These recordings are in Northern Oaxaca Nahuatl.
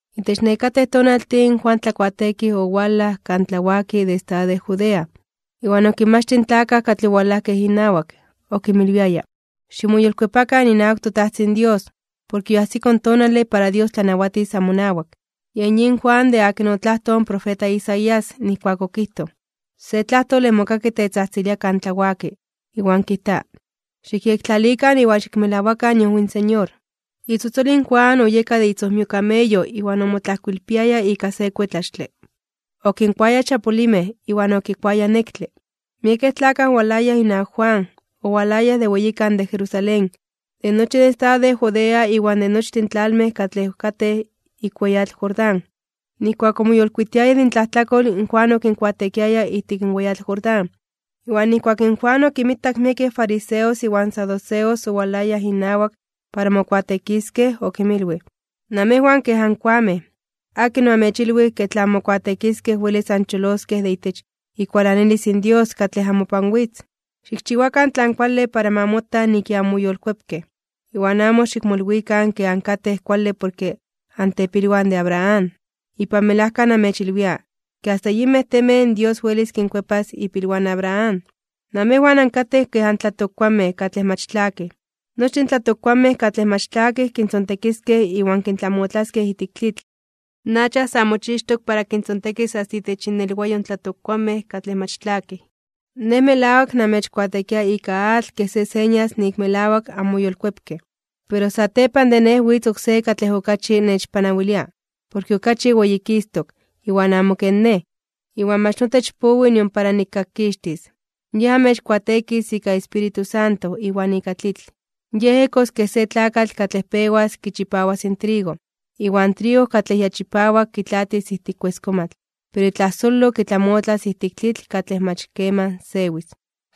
Itech nekatej tonaltin in Juan Tlakuateekij owalaj kan tlawaki de estado de Judea, iwan okinmachtij in tlakaj katlej owalajkej inawak. Okinmilwiaya: ―Ximoyolkuepakan inawak toTajtzin Dios, porke yoajsiko in tonale para Dios tlanawatis amonawak. Yen yin Juan de akin otlajtoj in profeta Isaías, nijkuak okijtoj: Se tlajtole mokaki tetzajtzilia kan tlawaki, iwan kijta: “Xikyektlalikan iwan xikmelawakan iojwi in Señor.” Itzotzol in Juan oyeka de itzojmio kameyo iwan omotlajkoilpiaya ika se kuetlaxtle. Okinkuaya chapulimej (xolinmej) iwan okikuaya nektle. Miekej tlakaj owalayaj inawak Juan, owalayaj de weyikan de Jerusalén, de nochi in estado de Judea iwan de nochtin in tlalmej katlej katej ik weyatl Jordán. Nijkuak omoyolkuitiayaj de intlajtlakol, in Juan okinkuateekiaya ijtik in weyatl Jordán. Iwan nijkuak in Juan okinmitak miekej fariseos iwan saduceos owalayaj inawak para mokuateekiskej, okinmilwij: ―¡Namejwan kej ankoamej! ¿Akin oamechilwij ke tla anmokuateekiskej welis ancholoskej de itech ikualanilis in Dios katlej amopan witz? Xikchiwakan tlan kuale para ma mota nik ya anmoyolkuepkej. Iwan amo xikmolwikan ke ankatej kuale porke antepilwan de Abraham. Ipan melajka namechilwia, ke asta yinmej temej in Dios welis kinkuepas ipilwan in Abraham. Namejwan ankatej ken tlatokkuanmej katlej mach tlakij. Nochtin in tlatokkuanmej katlej mach tlakij motzontekiskej iwan kintlamotlaskej ijtik tlitl. In acha sa mochixtok para kintzontekis asta itech innelwayo in tlatokkuanmej katlej mach tlakij. Nej melawak namechkuateekia ika atl kej se señas nik melawak anmoyolkuepkej. Pero satepan de nej witz oksé katlej okachi nechpanawilia, porke okachi weyikistok (weyititok) iwan amo ken nej, iwan mach notech powi nion para nikkakkixtis. Yej amechkuateekis ika Espíritu Santo iwan ika tlitl. Yej ejkos kej se tlakatl katlej pewas kichipawas in trigo. Iwan trigo katlej ya chipawak kitlaatis ijtik kueskomatl, pero itlajsolo kitlamotlas ijtik tlitl katlej mach keman sewis.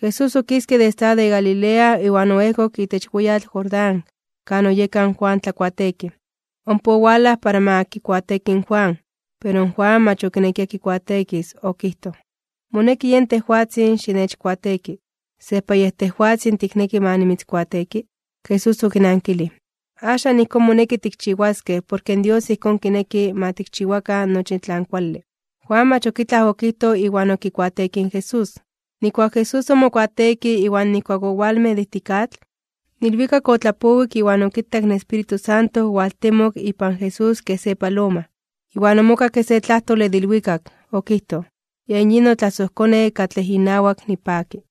Jesús okiske de estado de Galilea iwan oejkok itech weyatl Jordán kan oyeka in Juan Tlakuateekij, ompa owalaj para ma kikuateeki in Juan. Pero in Juan mach okinekia kikuateekis. Okijtoj: ―Moneki yen tejwatzin xinechkuateeki. ¿Sejpa yej tejwatzin tikneki ma nimitzkuateeki? Jesús okinankilij: ―Axan ijkón moneki tikchiwaskej, porke in Dios ijkón kineki ma tikchiwakan nochi tlan kuale. Juan mach ok itlaj okijtoj iwan okikuateekij in Jesús. Nijkuak Jesús omokuateekij iwan nijkuak owalmej de ijtik atl, in ilwikak otlapowik iwan okitak in Espíritu Santo owaltemok ipan Jesús kej se paloma. Iwan omokakke se tlajtole de ilwikak. Okijtoj: ―Yen yin notlasojKone, katlej inawak nipaki.